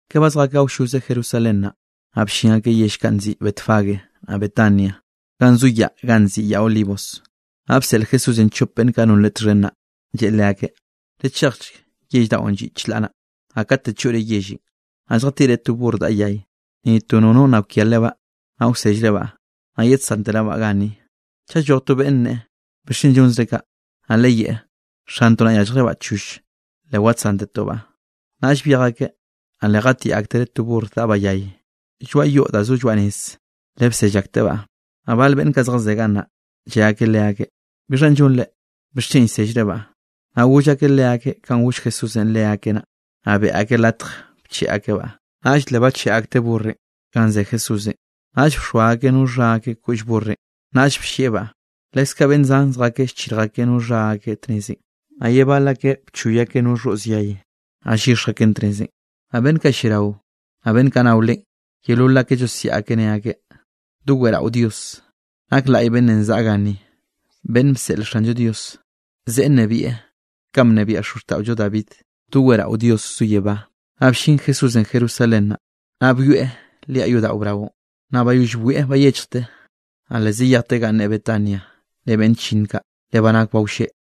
Ka ba zjakeꞌ awlloze Jerusalén naꞌ, naꞌ bllin akeꞌ yell kaꞌ nziꞌi Betfagé, naꞌ Betania ganꞌ zo yaꞌ ganꞌ nziꞌi Yaꞌ Olivos. Naꞌ bseꞌl Jesúsenꞌ chop beꞌnn kaꞌ non Leꞌe txhen naꞌ, lleꞌe leakeꞌ: —Lechejchk yell daꞌon lliꞌ chlaꞌ naꞌ, naꞌ kate choꞌre yellenꞌ, naꞌ lljatiꞌre to burr daꞌa yay, ni to nono nna kwia lebaꞌ, naꞌ wsellrebaꞌ, naꞌ yedsanterebaꞌ ganni. Chaꞌ lloj to beꞌnn nneꞌe: “¿Bixchen llonzre kaꞌ?”, naꞌ leyeꞌe: “Xantoꞌ naꞌ yálljrebaꞌ choll, le wadsántetobaꞌ.” Naꞌll byej akeꞌ, naꞌ le jatiꞌ aktereꞌ to burrenꞌ daꞌbaꞌ yay lloaꞌ yoꞌ da zo lloaꞌ nez, le bsell aktebaꞌ. Naꞌ bal beꞌnn kaꞌ zjazé gannaꞌ, lle akeꞌ leakeꞌ: —¿Bixhanꞌ llonre? ¿Bixchen llsellrebaꞌ? Naꞌ goll akeꞌ leakeꞌ kanꞌ goll Jesúsenꞌ leakeꞌ naꞌ. Naꞌ beꞌe akeꞌ latj bcheꞌe akebaꞌ. Naꞌll le bacheꞌe akteꞌ burrenꞌ ganꞌ ze Jesúsenꞌ, naꞌll bxoa akeꞌ no xha akeꞌ koꞌll burrenꞌ, naꞌll bllieꞌbaꞌ. Leskaꞌ beꞌnn zan zjakeꞌ llchirj akeꞌ no xha akeꞌ tnezenꞌ, naꞌ ye bal akeꞌ bchoy akeꞌ no xhoꞌz yay, naꞌ llyixj akeꞌn tnezenꞌ. Naꞌ beꞌnn kaꞌ lliarao, naꞌ beꞌnn kaꞌ nao Leꞌen, yeolol akeꞌ llosiaꞌ akeꞌ ne akeꞌ: —¡Doweꞌrao Dios! ¡Nak laꞌy beꞌnnenꞌ zaꞌa ganni beꞌnn bseꞌl Xanllo Diosenꞌ! ¡Zeꞌe nnebieꞌ kanꞌ bnebiaꞌ xozxtaꞌollo David! ¡Doweꞌrao Dios zo yebá! Naꞌ bllin Jesúsenꞌ Jerusalén, naꞌ byoeꞌ liaꞌ yodaꞌo braonꞌ. Naꞌ bayoll bwieꞌ bayechjteꞌ, naꞌ le zayejteꞌ ganꞌ ne Betania ren beꞌnn chllinn kaꞌ, le ba nak ba wlleꞌ.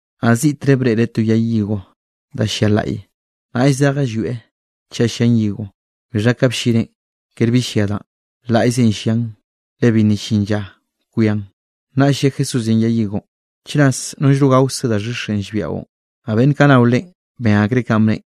Naꞌ ziꞌtre breꞌreꞌ to yay higo da llia laꞌye, naꞌll zejeꞌ llwieꞌ chaꞌ llian higo, bixha ka bllineꞌn kere bi llia danꞌ, laꞌyze llian le bi nna llin lla kwian. Naꞌll lle Jesúsenꞌ yay higonꞌ: —Chras nollno gaokze da xhixenꞌ llbiaꞌo. Naꞌ beꞌnn kaꞌ nao Leꞌen ben akreꞌ kanꞌ bneꞌen.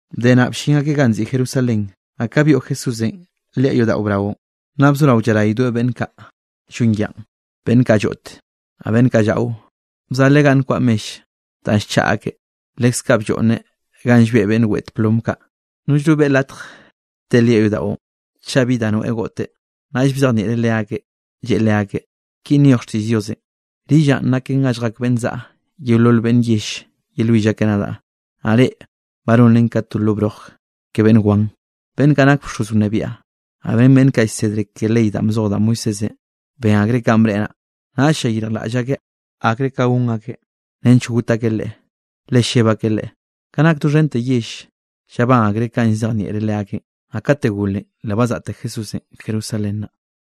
Bde naꞌ, bllin akeꞌ ganꞌ nziꞌi Jerusalén. Naꞌ ka byoꞌ Jesúsenꞌ liaꞌ yodaꞌo braonꞌ, naꞌ bzoraweꞌ llaraydoeꞌ beꞌnn kaꞌ llon yaꞌa, beꞌnn kaꞌ lloꞌt, naꞌ beꞌnn kaꞌ llaꞌo. Bzaleꞌ ganꞌ nkwaꞌa mell danꞌ llchaꞌa akeꞌ, leskaꞌ blloꞌnneꞌ ganꞌ llbeꞌ beꞌnn weꞌt plom kaꞌ. Nollno beꞌe latj te liaꞌ yodaꞌon, chaꞌ bi da noeꞌ goꞌteꞌ. Naꞌll bzejnieꞌreꞌ leakeꞌ, lleꞌe leakeꞌ: —Kinꞌ nyoj xtiꞌll Diosenꞌ: “Rillaꞌn, naken ga lljak beꞌnn zaꞌa yeolol yell yelwill akeꞌ nadaꞌ”; naꞌ reꞌ, ba nonren ka to lo broj ke beꞌnn wan. Beꞌnn kaꞌ nak bxoz wnebiaꞌ, naꞌ ren beꞌnn kaꞌ llsedre ke ley danꞌ bzoj da Moisésenꞌ, ben akreꞌ kanꞌ bneꞌe naꞌ, naꞌll llayirjlaꞌll akeꞌ akre ka gon akeꞌ nench got akeꞌ Leꞌe, le lleb akeꞌ Leꞌe, ka nak doxhente yell, llabán akreꞌ kanꞌ llzejnieꞌreꞌ leakeꞌn. Naꞌ kate golenꞌ, le bazaꞌte Jesúsenꞌ Jerusalén naꞌ.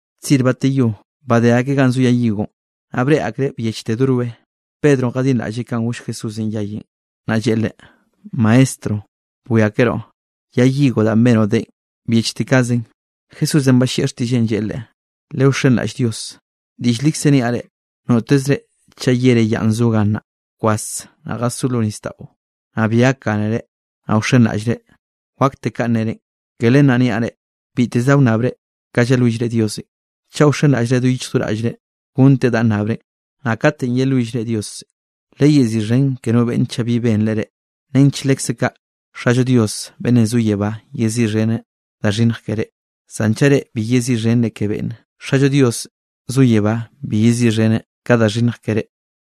Tzir bateyó badé akeꞌ ganꞌ zo yay higonꞌ, naꞌ breꞌe akreꞌ byechte do roe. Pedronꞌ jadinraꞌlleꞌ kanꞌ goll Jesúsenꞌ yayenꞌ, naꞌ lleꞌe Leꞌe: —Maestro, bwiakeroꞌ yay higonꞌ danꞌ benoꞌ deꞌen byechte kaꞌzenꞌ. Jesúsenꞌ ballieꞌ xtiꞌlleꞌn lleꞌe leꞌe: —Lewxenraꞌll Dios. Diꞌll likze llniaꞌ reꞌ, notezre chaꞌ yere yaꞌn zo gannaꞌ: “Bkwas naꞌ jasó lo nisdaꞌo”, naꞌ bi gakgánere naꞌ wxenraꞌllre, wakte kanꞌ nerenꞌ. Ke len naꞌ niaꞌ reꞌ, biteze da wnnabre ka yelwillre Diosenꞌ, chaꞌ wxenraꞌllre do yichj do raꞌllre, gonteꞌ danꞌ nnabrenꞌ. Naꞌ katenꞌ yelwillre Diosenꞌ, leyeziꞌxhen ke no beꞌnne chaꞌ bi benreꞌ reꞌ nench lekze kaꞌ, Xallo Diosenꞌ beꞌnn zo yebá yeziꞌxheneꞌ da xhinnj ke reꞌ. Zan chaꞌ reꞌ bi yeziꞌxhenre ke beꞌnne, Xallo Dios zo yebá bi yeziꞌxheneꞌ ka da xhinnj ke reꞌ.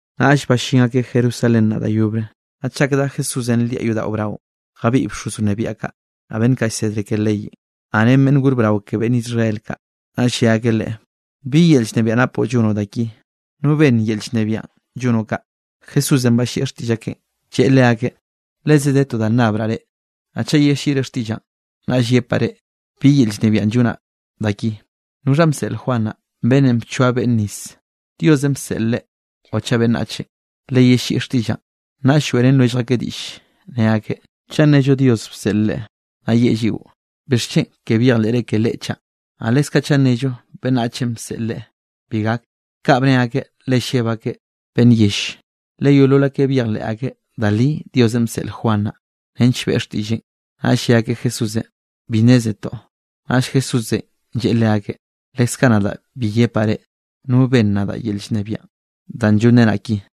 Naꞌll ballín akeꞌ Jerusalén naꞌ da yobre, naꞌ chak dá Jesúsenꞌ liaꞌ yodaꞌo braonꞌ, jabiꞌy bxoz wnebiaꞌ kaꞌ, naꞌ beꞌnn kaꞌ llsedre ke leyenꞌ, naꞌ ren beꞌnn gor brao ke beꞌnn Israel kaꞌ. Naꞌll lle akeꞌ Leꞌe: —¿Bi yel llnebiaꞌ napoꞌ llonoꞌ da ki? ¿No benn yel llnebiaꞌ llonoꞌ kaꞌ? Jesúsenꞌ ballieꞌ xtiꞌll akeꞌn, lleꞌe leakeꞌ: —Leze de to da nnabraꞌ reꞌ, naꞌ chaꞌ yelliꞌre xtiꞌllaꞌn, naꞌll yepaꞌ reꞌ bi yel llnebiaꞌn llonaꞌ da ki. ¿Noxhanꞌ bseꞌl Juan naꞌ, beꞌnnenꞌ bchoa beꞌnn nis? ¿Diosenꞌ bseꞌl leꞌe o chaꞌ beꞌnnachenꞌ? Leyelliꞌi xtiꞌllaꞌn. Naꞌll lloeꞌrén lwellj akeꞌ diꞌll, ne akeꞌ: —Chaꞌ nnello Dios bseꞌl leꞌe, naꞌ yeꞌe lliꞌo: “¿Bixchen ke byejleꞌre ke leꞌe chaꞌ?” Naꞌ leskaꞌ chaꞌ nnello beꞌnnachenꞌ bseꞌl leꞌe, bi gak. Kaꞌ bne akeꞌ, le lleb akeꞌ beꞌnn yell, le yeolol akeꞌ byejleꞌ akeꞌ da li Diosenꞌ bseꞌl Juan naꞌ, nench beꞌe xtiꞌlleꞌn. Naꞌll lle akeꞌ Jesúsenꞌ: —Bi nnézetoꞌ. Naꞌll Jesúsenꞌ lleꞌe leakeꞌ: —Leskaꞌ nadaꞌ bi yepaꞌ reꞌ no benn nadaꞌ yel llnebiaꞌn da llonrenaꞌ ki.